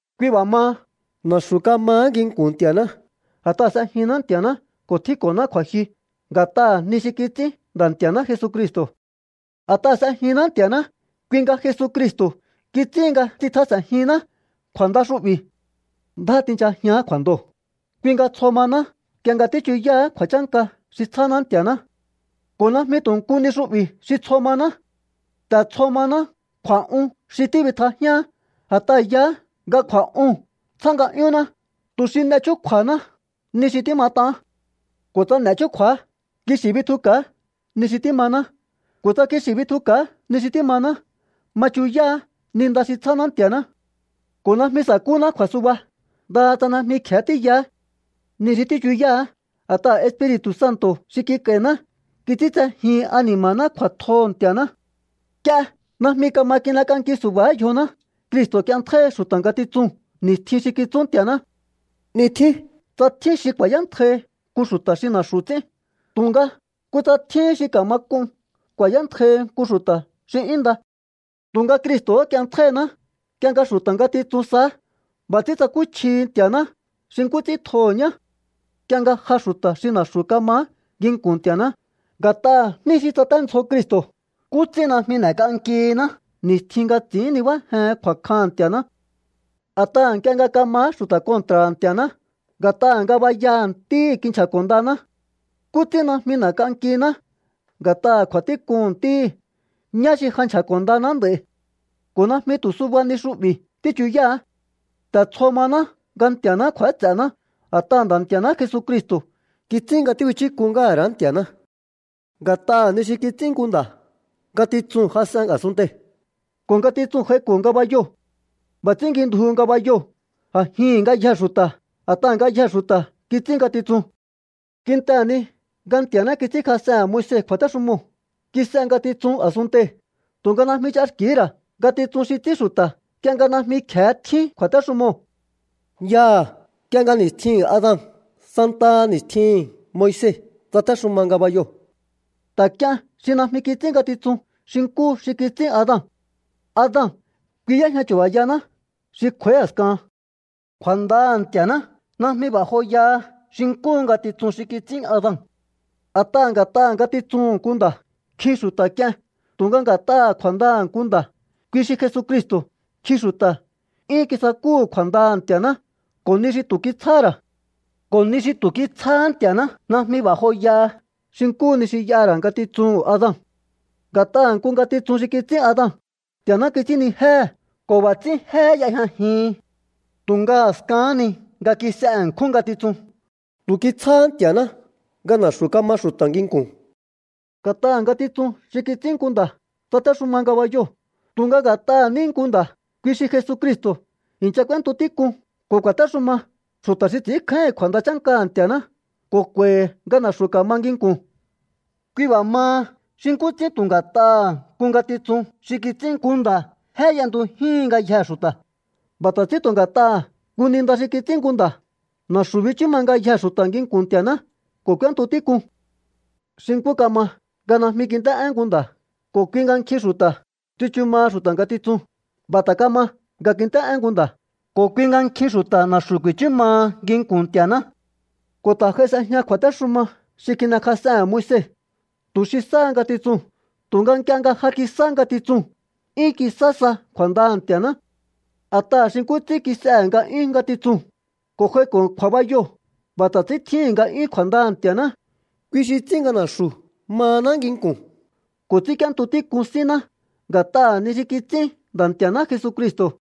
Kui b'a̱ maha, na̱xu̱ kamaá nginku̱n Nti̱a̱ná a̱t'aha̱ s'ejihinná Nti̱a̱ná ko̱ tjínko̱ná kju̱a̱jyu nga̱t'aha̱ ni xi kits'ín Nda̱ Nti̱a̱ná Jesucristo̱. A̱t'aha̱ s'ejinná Nti̱a̱ná, kui nga Jesucristo̱ kits'íhin nga tsitjas'e̱njihinná kju̱a̱nda xu'bi̱. Ndjá tinchajián kju̱a̱ndoo̱. Kui nga tsjo mahaná nk'ie nga tíchuyáá kju̱a̱chánka xi tsjáná Nti̱a̱ná. Ko̱ najmi tu̱ nku ni xu'bi̱ xi tsjo maná. Ta̱ tsjo maná kju̱a̱'un xi tíbitjajíaán, a̱t'aha̱ yaá nga kju̱a̱'uu̱n tsjá nga'yúnná tu̱ xi n'e chúkju̱a̱haná ni xi tímat'aán. Ko̱ tsa n'e chúkju̱á, kixi̱ bitjuka̱á ni xi tímaná. Ko̱ tsa kixi̱ bitjuka̱á ni xi tímaná, ma chuyáá ni nda xi tsjáná Nti̱a̱ná. Ko̱ najmi sa̱kúná kju̱a̱suba, ndaha tsa najmi kje̱e tíyaá ni xi tíchuyáá. A̱t'aha̱ Espiri̱tu̱ Santo̱ xi kik'a̱i̱ná kits'íntsejíhin ani̱ma̱ná kju̱a̱tjoho̱ Nti̱a̱ná. Nk'ie najmi kama kin'ek'anki su̱ba̱á yjoná, Cristo̱ k'ienntjáíhi xu̱ta̱ ngatitsuu̱n ni̱stjin xi kitsú Nti̱a̱ná. 'Ni tjín tsa tjín xi ku̱a̱yántjai nku xu̱ta̱ xi na̱xu̱ ts'ín, tu̱nga kutsa tjíhín xi ka̱ma k'un ku̱a̱yántjai nku xu̱ta̱ xi 'yún nda. Tu̱nga Cristo̱hó k'ienntjáíhiná nk'ie nga xu̱ta̱ ngatitsun saá. B'a̱ ts'ín tsakúchjihi Nti̱a̱ná xi nkú ts'ín tjoho̱ ñá. Nk'ie nga ja xu̱ta̱ xi na̱xu̱ kamaá nginku̱n Nti̱a̱ná nga̱t'aha̱ jní xi tsaténdzjo Cristo̱, ¿nkú ts'ín najmi n'e̱k'ankihiná ni̱stjin nga ts'i̱ín nibájen kju̱a̱kjaha̱n Nti̱a̱ná? A̱t'aha̱ nk'ie nga kamaá xu̱ta̱ kontra̱ha̱ Nti̱a̱ná, nga̱t'aha̱ ngabayaha̱ Ntíhi̱ kinchja̱ko̱ ndaná. ¿Nkú ts'ín najmi n'e̱k'ankiná nga̱t'aha̱ kju̱a̱tík'uhu̱n Ntíhi̱, ñá xi ja nchja̱ko̱ ndaná nd'a̱i̱? Ko̱ najmi tu̱ suba ni xu'bi̱ tíchuyáá. Ta̱ tsjo maná nga Nti̱a̱ná kju̱áts'e̱ná, a̱t'aha̱ Nda̱ Nti̱a̱ná Jesucristo̱ kits'ín nga tíbichúk'un ngáha̱ ra̱á Nti̱a̱ná. Nga̱t'aha̱ ni xi kits'ín nku nda̱ ngatitsuu̱n jas'en a̱sunntei̱ ko̱ ngatitsuu̱n j'aiko̱ ngabayoo̱. B'a̱ ts'ín ngjindjuhu ngabayoo̱ a̱jihi̱n ngayjee̱ xu̱ta̱, a̱t'aha̱ ngayjee̱ xu̱ta̱ kits'ín ngatitsun. Kintehe̱ ni nga Nti̱a̱ná kits'ínkjas'ehe̱n Moise kju̱a̱téxumoo̱ kis'e ngatitsun a̱sunntei̱, tu̱nga najmi ch'axki̱hí ra̱ ngatitsun xi ts'ín xu̱ta̱ nk'ie nga najmi kje̱e tjín kju̱a̱téxumoo̱. Yaha̱ nk'ie nga ni̱stjihi̱n Adan santaha ni̱stjihi̱n Moise tsatéxuma ngabayoo̱. Ta̱ k'ien xi najmi kits'ín ngatitsun xi nkúhu xi kits'ín Adan. Adan, kui y'éjña chu̱ba̱yaná xi kj'u̱a̱í a̱skahan. Kju̱a̱ndaha̱ Nti̱a̱ná najmi b'a̱ joyaha xi nkúhu ngatitsun xi kits'ín Adan. A̱t'aha̱ nga̱t'aha̱ ngatitsuhu̱n nku nda̱ nkjin xu̱ta̱ k'ien, tu̱nga nga̱t'aha̱ kju̱a̱ndaha̱ nku nda̱, kui xi Jesucristo̱, nkjin xu̱ta̱ 'yún kisakúhu̱ kju̱a̱ndaha̱ Nti̱a̱ná ko̱ ni xi tu̱ kitsjáhá ra̱. Ko̱ ni xi tu̱ kitsjáhá Nti̱a̱ná najmi b'a̱ joyaha xi nkúhu ni xi y'aha̱ ra̱ ngatitsuhu̱n Adan. Nga̱t'aha̱ nku ngatitsun xi kits'ín Adan, Nti̱a̱ná kits'ínnijéhe̱ ko̱ b'a̱ ts'ín jé y'ejñajihin. Tu̱nga a̱skahán ni nga kis'e ṉkjún ngatitsun, tu̱ kitsjáhá Nti̱a̱ná nga na̱xu̱ kama xu̱ta̱ nginku̱n. Nga̱t'aha̱ ngatitsun xi kits'ín nku nda̱ tsatéxuma ngabayoo̱, tu̱nga nga̱t'aha̱ ní nku nda̱, kui xi Jesucristo̱, i̱ncha k'úéntu tík'un ko̱ ku̱a̱téxuma xu̱ta̱ xi ts'i̱ínkjáíhi̱n kju̱a̱nda chánkaha̱ Nti̱a̱ná ko̱ k'u̱a̱i̱hi̱ nga na̱xu̱ ka̱ma nginku̱n. Kui b'a̱ maha, xi nkú ts'ín tu̱ nga̱t'aha̱ nku ngatitsun xi kits'ín nku nda̱ jé y'entujíhin ngayjee̱ xu̱ta̱, b'a̱ ta̱ ts'ín tu̱ nga̱t'aha̱ nku ni nda xi kits'ín nku nda̱ na̱xu̱ bichú ma ngayjee̱ xu̱ta̱ nginku̱n Nti̱a̱ná ko̱ k'úéntu tík'un. Xi nkú kama nga najmi kint'é'én nku nda̱ ko̱ kui nga nkjin xu̱ta̱ tsichu maha xu̱ta̱ ngatitsun, b'a̱ ta̱ kama nga kint'é'én nku nda̱ ko̱ kui nga nkjin xu̱ta̱ na̱xu̱ ku̱i̱chú maha nginku̱n Nti̱a̱ná. Ko̱ ta̱ j'ai s'ejña kju̱a̱téxuma xi kin'ekjas'ehe̱n Moise tu̱ xi sáha ngatitsuu̱n, tu̱nga nk'ie nga ja kisá ngatitsuu̱n, 'yún kisá sa kju̱a̱ndaha̱ Nti̱a̱ná. A̱t'aha̱ xi nkú ts'ín kis'ehe̱ nga'yún ngatitsuu̱n ko̱ j'aiko̱ kju̱a̱bayoo̱, b'a̱ ta̱ ts'ín tjíhi̱n nga'yún kju̱a̱ndaha̱ Nti̱a̱ná, kui xi ts'ín nga na̱xu̱ mahaná nginku̱n ko̱ ts'ínk'íéntu tík'un sínná nga̱t'aha̱ ni xi kits'ín Nda̱ Nti̱a̱ná Jesucristo̱.